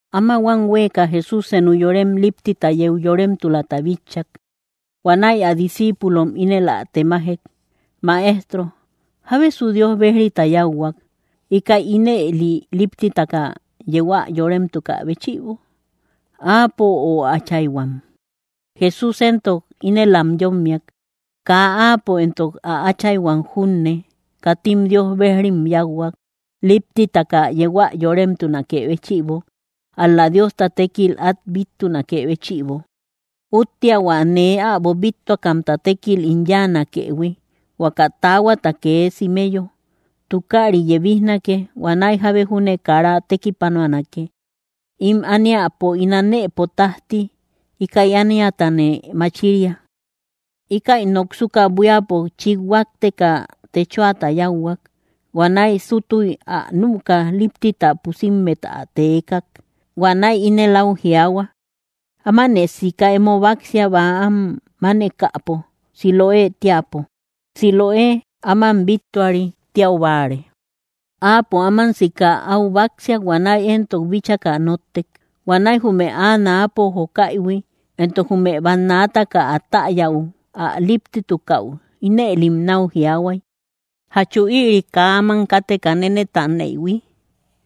Áma huam huéeka Jesús senu yorem líptita yeu yoremtulata bitchak. Huanäi ä discíipulom ínel ä temajek: —Maestro, ¿jábesu Dios bejrita yáuhuak, íkäi ínëli líptitaka yeu ä yoremtukä béchïbo? ¿Áapo, o ä áchayhuam? Jesús éntok ínel am yómmiak: —Kaa áapo éntok ä áchayhuam junne, katim Dios bejrim yáuhuak, líptitaka yeu ä yoremtunakë béchïbo; ál‑la Diosta tékilta át bittunakë béchïbo. Úttea hua nee äbo bíttuakamta tékil ín yáanakëhui, huaka taahuata kee simeyo. Tukaari yebijnake; huanäi jábe júne kara tekipanuanake. Ím ániapo ín anëpo tájti, íkäi ániatane machiria. Íkäi noksuka, buíapo chít huátteka, techoata yáuhuak. Huanäi súttuy ä nüka, líptita pusimmet ä teekak. Huanäi ínel áu jiaahua: —Ámanë sika emo báksia bäam mánekäpo Siloë teäpo. (Siloë “áman bíttuari” tiau báare.) Áapo áman sika áu báksiak; huanäi entok bíchaka nóttek. Huanäi jume áa náapo jóakaïhui, éntok jume bannaataka ä täyäu ä líptitukau, ínëlim náu jiaahuay: —¿Jachu ïri kaa áman káteka nénetaneïhui?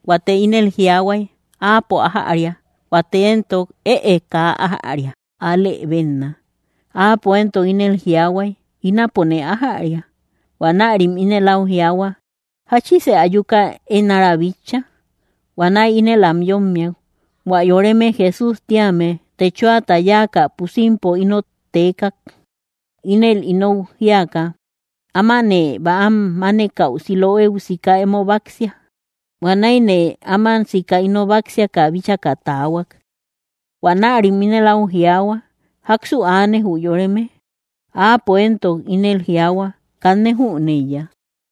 Huate ínel jiaahuay: —Áapo ájäria. Huate éntok: —Ëe, kaa ájäria. Alë bénna. Áapo éntok ínel jiaahuay: —Ínapone ájäria. Huanärim ínel áu jiaahua: —¿Jáchisë ayuka én ára bitcha? Huanäi ínel am yómmiak: —Huä yoreme Jesús tíame techoata yáaka pusimpo ínot teekak, ínel inou jíaka: “Ámanë bäam mánekäu Siloéu sika emo báksia.” Huanäine áman sika ino báksiaka bíchaka taahuak. Huanärim ínel áu jiaahua: —¿Jáksu aane, jü yoreme? Áapo éntok: —Ínel jiaahua —kanne jüneiya.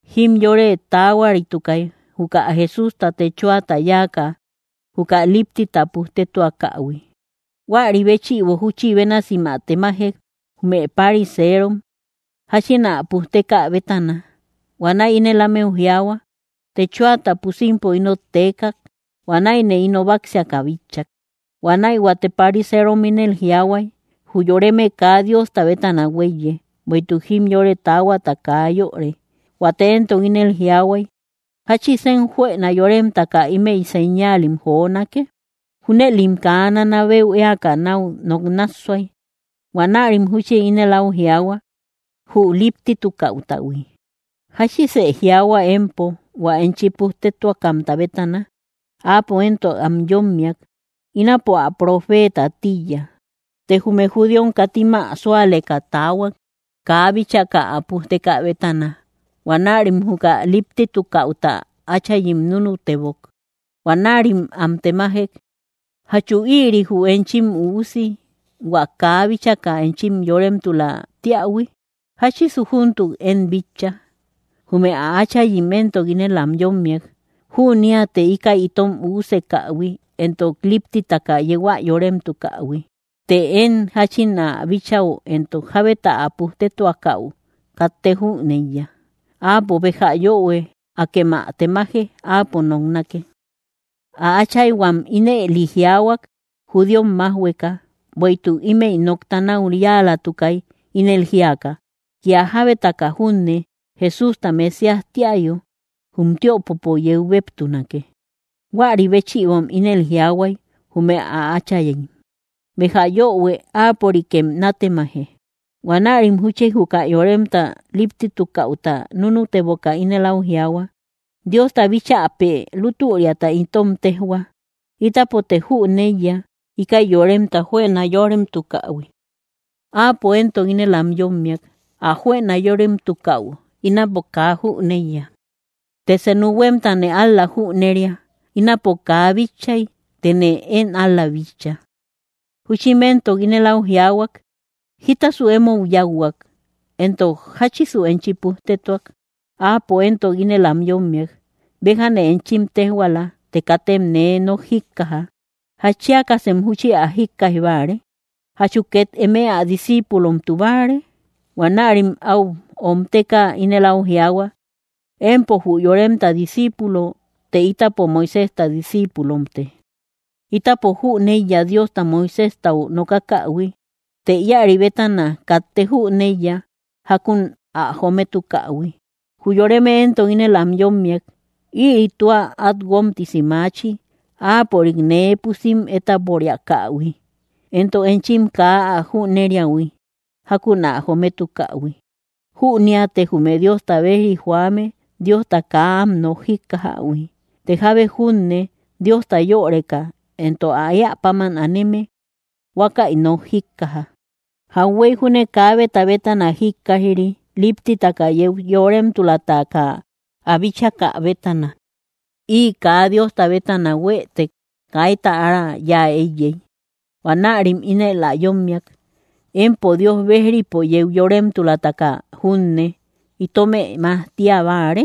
Jimyore taahuaritukay, juka Jesústa techoata yáaka, juka líptita pujtetuakähui. Huäri béchïbo, júchi bénasim ä temajek, jume pariseerom, jáchín ä pujtekä bétana. Huanäi ínel ámeu jiaahua: —Techoata pusimpo ínot teekak. Huanäine ino báksiaka bitchak. Huanäi huate pariseerom ínel jiaahuay: —Jü yoreme kaa Diosta bétana huéiye, bueïtuk jimyore taahuata kaa yöre. Huate éntok ínel jiaahuay: —¿Jáchisen juëna yóremtaka ímëi señaalim jonake? Júnëlim kaa nanabeu éaka náu nok nássuay. Huanärim júchi ínel áu jiaahua, jü líptitukäutahui: —¿Jáchisë jiaahua empo, hua enchi pujtetuakamta bétana? Áapo éntok am yómmiak: —Ínapo, ä profeeta tíiya. Të jume judíom katim ä súaleka taahuak, kaa bíchaka ä pujtekä bétana. Huanärim juka líptitukäuta áchayim núnutebok. Huanärim am temajek: —¿Jachu ïri jü enchim üusi, hua kaa bíchaka enchim yóremtula tíähui? ¿Jáchisu júntuk én bitcha? Jume ä áchayim entok ínel am yómmiak: —Jüneate íkäi itom üusekähui, éntok líptitaka yeu ä yóremtukähui; të én jáchin ä bíchäu, éntok jábeta ä pujtetuakäu, katte jüneiya. Áapo béja yöhue; akem ä temaje. Áapo noknake. Ä áchayhuam ínëli jiaahuak, judíom májhueka. Bueïtuk ímëi nokta náu yáalatukay, ínel jíaka: “Kía jábeta junne Jesústa Mesías tíayo, jum tiöpopo yeu béeptunake.” Huäri béchïbom ínel jiaahuay, jume ä áchayim: “Béja yöhue; áapörikem nátemaje.” Huanärim júchi juka yoremta líptitukäuta núnuteboka, ínel áu jiaahua: —Diosta bíchäpe lútüriata itom téjhua. Ítapote jüneiya íkäi yoremta juëna yóremtukähui. Áapo éntok ínel am yómmiak: —Ä juëna yóremtukäu, ínapo kaa jüneiya. Të senu huémtane ál‑la jüneria: ínapo kaa bitchay, tëne én ál‑la bitcha. Júchim éntok ínel áu jiaahuak: —¿Jítasu emou yáuhuak? Éntok, ¿jáchisu enchi pujtetuak? Áapo éntok ínel am yómmiak: —Béjane enchim téjhuaala, të katem nee nok jíkkaja. ¿Jatchiakasem júchi ä jíkkaij báare? ¿Jachu két eme ä discíipulomtu báare? Huanärim áu omteka ínel áu jiaahua: —Empo jü yoremta disciipulo; të ítapo Moiséjta discíipulomte. Ítapo jüneiya Diosta Moiséjtau nokakähui; të íäri bétana, katte jüneiya jákun ä jometukähui. Jü yoreme éntok ínel am yómmiak: —Ïri tua át guómtisi maachi, áapörik nee pusim étaporiakähui, éntok enchim kaa ä jüneriähui jákun ä jometukähui. Jüneate jume Diosta bejri joame Diosta kaa am nok jíkkajähui; të jábe junne Diosta yöreka, entok ä éä páman áneme, huákäi nok jíkkaja. Jauhuey júne kaabeta bétana jíkkaij‑ri líptitaka yeu yóremtulataka ä bíchakä bétana. Ï kaa Diosta bétana huëtek, kaita ára yáa éiyey. Huanärim ínel ä yómmiak: —Empo Dios bejripo yeu yóremtulataka junne, ¿itomë majtia báare?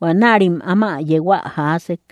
Huanärim áma yeu ä jaasek.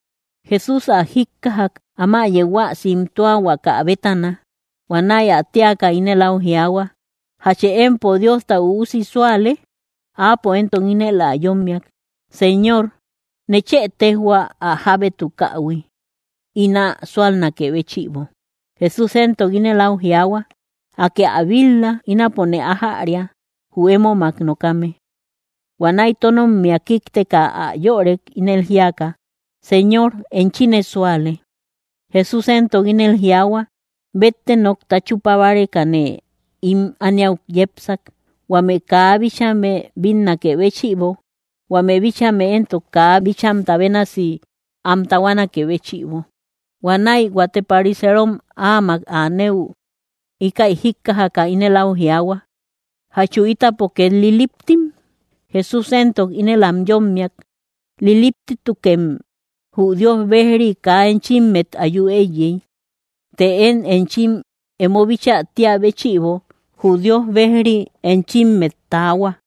Jesús ä jíkkajak, áma yeu ä simtuahuaka bétana. Huanäi ä téaka, ínel áu jiaahua: —¿Jachë empo Diosta Üusi súale? Áapo éntok ínel ä yómmiak: —Señor, nechë téjhua ä jábétukähui, ín ä súalnakë béchïbo. Jesús éntok ínel áu jiaahua: —Akë ä bil-la; ínapone ájäria, jü émomak nokame. Huanäi tónommia kíkteka ä yörek, ínel jíaka: —Señor, enchine súale. Jesús éntok ínel jiaahua: —Bette nokta chúpa bárekane ím ániau yepsak, huame kaa bíchame bínnakë béchïbo, huame bíchame éntok kaa bíchamta bénasi am tahuanaké béchïbo. Huanäi huate pariseerom áamak anëu, íkäi jíkkajaka, ínel áu jiaahua: —¿Jachu ítapo két liliptim? Jesús éntok ínel am yómmiak: —Liliptimtukem, jü Dios bejri kaa enchimmet ayu éiyey. Të én enchim emo bíchä tíä béchïbo, jü Dios bejri enchimmet taahua.